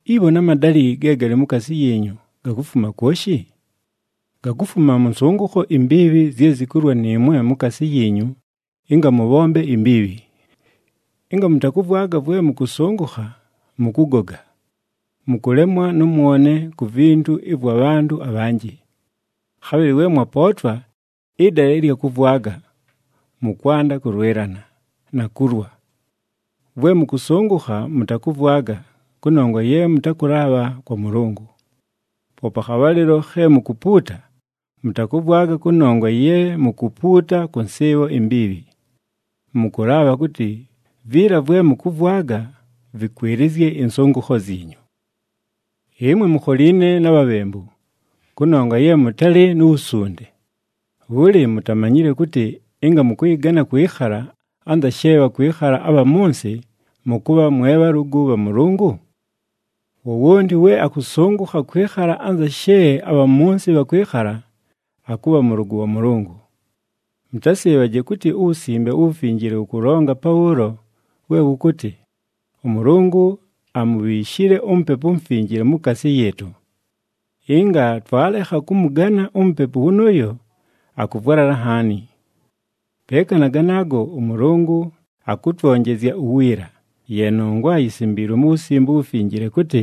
Ibho na madalɨ ge galɨ mukaasi yiinyu, gakufuma kwoshi? Gakufuma mʉ nsʉngʉkho imbiibhi zye zikulwa nɨɨmwe mukaasi yiinyu ɨnga mʉbhombe imbiibhi! Ɨnga mʉtakʉvwaga vwe mʉkʉsʉngʉkha, mʉkʉgoga. Mʉkʉlemwa nʉ mwone ku vintu ɨvwa bhantʉ abhanjɨ. Khabhɨlɨ we mwapootwa ɨdala ɨlya kʉvwaga, mʉkwanda kʉlwɨlana, na kulwa. Vwe mʉkʉsʉngʉkha, mʉtakʉvwaga, kʉnongwa ye mʉtakʉlaabha kwa Mʉlʉngʉ! Poope akhabhalɨlo khe mukupuuta, mʉtakʉvwaga kʉnongwa ye mukupuuta kʉ nsɨɨbho imbiibhi. Mʉkʉlaabha kʉtɨ viila vwe mʉkʉvwaga vɨkwɨlɨzye ɨnsʉngʉkho zyinyu. Ɨmwe mukholiine na bhabhembu, kʉnongwa ye mʉtalɨ nu wusunde! Bhʉlɨ, mutamanyile kʉtɨ ɨnga mʉkʉyɨgana kwɨkhala anza she bhakwɨkhala abha mʉ nsɨ, mʉkʉbha mwe bhalʉgʉ bha Mʉlʉngʉ? Wowonti we akʉsʉngʉkha kwɨkhala anza she abha mʉ nsɨ bhakwɨkhala, akʉbha mʉlʉgʉ wa Mʉlʉngʉ. Mʉtasɨɨbhaje kʉtɨ uWusimbe uWufinjile wʉkʉlonga pabhʉʉlo we wʉkʉtɨ, “ɄMʉlʉngʉ amubhiishile uMupepu uMufinjile mukaasi yɨɨtʉ. Ɨnga twalekha kʉmʉgana uMupepu wʉnʉʉyo, akʉvwalala nhaani.” Peeka na ganaago, ʉMʉlʉngʉ akʉtwonjezya uwiila, ye nongwa yisimbiilwe mu Wusimbe uWufinjile, kʉtɨ,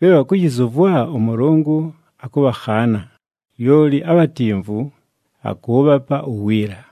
“Bhe bhakʉyɨzʉvwa, ʉMʉlʉngʉ akʉbhakhaana, lyoli abhatimvu, akʉʉbhapa uwiila.”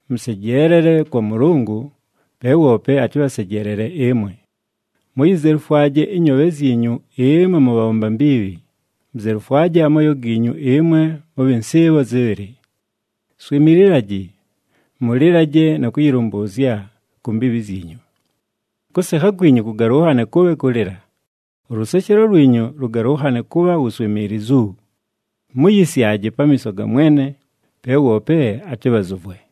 Mʉsejeelele kwa Mʉlʉngʉ, pe woope atɨbhasejeelele ɨmwe. Muyizelufwaje ɨnyoobhe zyinyu ɨmwe mʉbhabhomba mbiibhi, muzelufwaje amooyo giinyu ɨmwe mʉbhɨ nsɨɨbho zɨbhɨlɨ. Swimililaji, mʉlɨlaje na kʉyɨlʉmbʉʉzya ku mbiibhi zyinyu. Kʉsekha kwinyu kʉgalʉnhane kʉbhe kʉlɨla, ʉlʉseshelo lwinyu lʉgalʉnhane kʉbha wuswimiilizu. Muyisyaje pamiiso ga Mwene, pe woope atɨbhazʉvwe.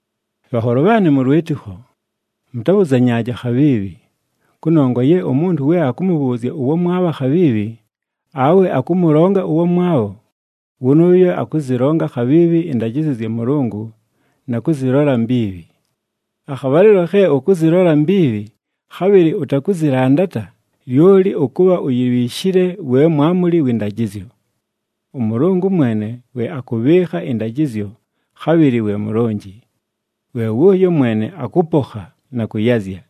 Bhanholo bhaanɨ mʉ lwɨtɨkho, mʉtabhʉzanyaaje akhabhiibhi, kʉnongwa ye umuntu we akʉmʉbhʉʉzya ʉwamwabho akhabhiibhi, awe akʉmʉlonga ʉwamwabho, wʉnʉʉyo akʉzɨlonga akhabhiibhi ɨndajɨzyo zya Mʉlʉngʉ na kʉzɨlola mbiibhi. Akhabhalɨlo khe ʉkʉzɨlola mbiibhi, khabhɨlɨ ʉtakʉzɨlandata, lyoli ʉkʉbha uyibhiishile we mwamuli wɨ ndajɨzyo. ɄMʉlʉngʉ mwene we akʉbhɨɨkha ɨndajɨzyo, khabhɨlɨ we Mulonji. We wʉʉyo mwene akʉpokha, na kʉyazya.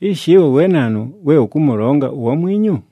Ishi, ɨwe we naanu we ʉkʉmʉlonga uwamwinyu?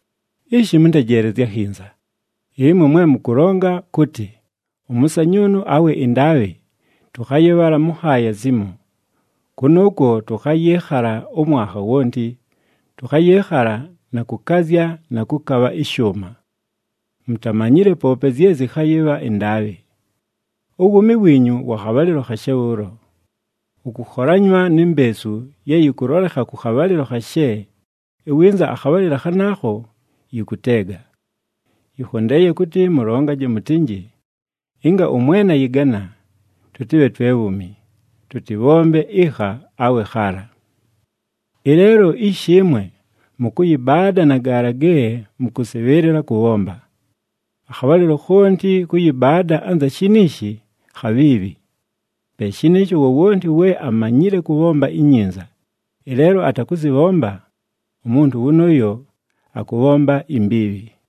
Ishi, mʉntejeelezye akhinza, ɨmwe mwe mʉkʉlonga kʉtɨ, “Ʉmʉsanyʉʉnʉ awe ɨndaabhɨ, tʉkhayɨbhala mʉ nhaaya zimo. Kʉnʉʉkwo tʉkhayɨɨkhala ʉmwanha wonti, tʉkhayɨɨkhala na kʉkazya na kʉkabha ɨshʉʉma.” Mutamanyile poope zye zɨkhayɨbha ɨndaabhɨ! Uwuumi wiinyu wa khabhalɨlo khashe bhʉʉlo! Wʉkʉkholanywa ni mbeesu ye yɨkʉlolekha kʉ khabhalɨlo khashe, iwinza akhabhalɨlo khanaakho yɨkʉteega! Yɨkhondeeye kʉtɨ mʉlongaje mʉtɨnjɨ, “Ɨnga ʉMwene ayɨgana, tʉtɨbhe twe bhuumi, tʉtɨbhombe ɨkha awe khaala.” Ɨleelo ishi ɨmwe, mʉkʉyɨbaada na gaala ge mʉkʉsɨbhɨɨlɨla kʉbhomba. Akhabhalɨlo khonti kʉyɨbaada anza shiniishi, khabhiibhi. Pe shɨnɨɨsho, wowonti we amanyile kʉbhomba inyinza, ɨleelo atakʉzɨbhomba, umuntu wʉnʉʉyo akʉbhomba imbiibhi.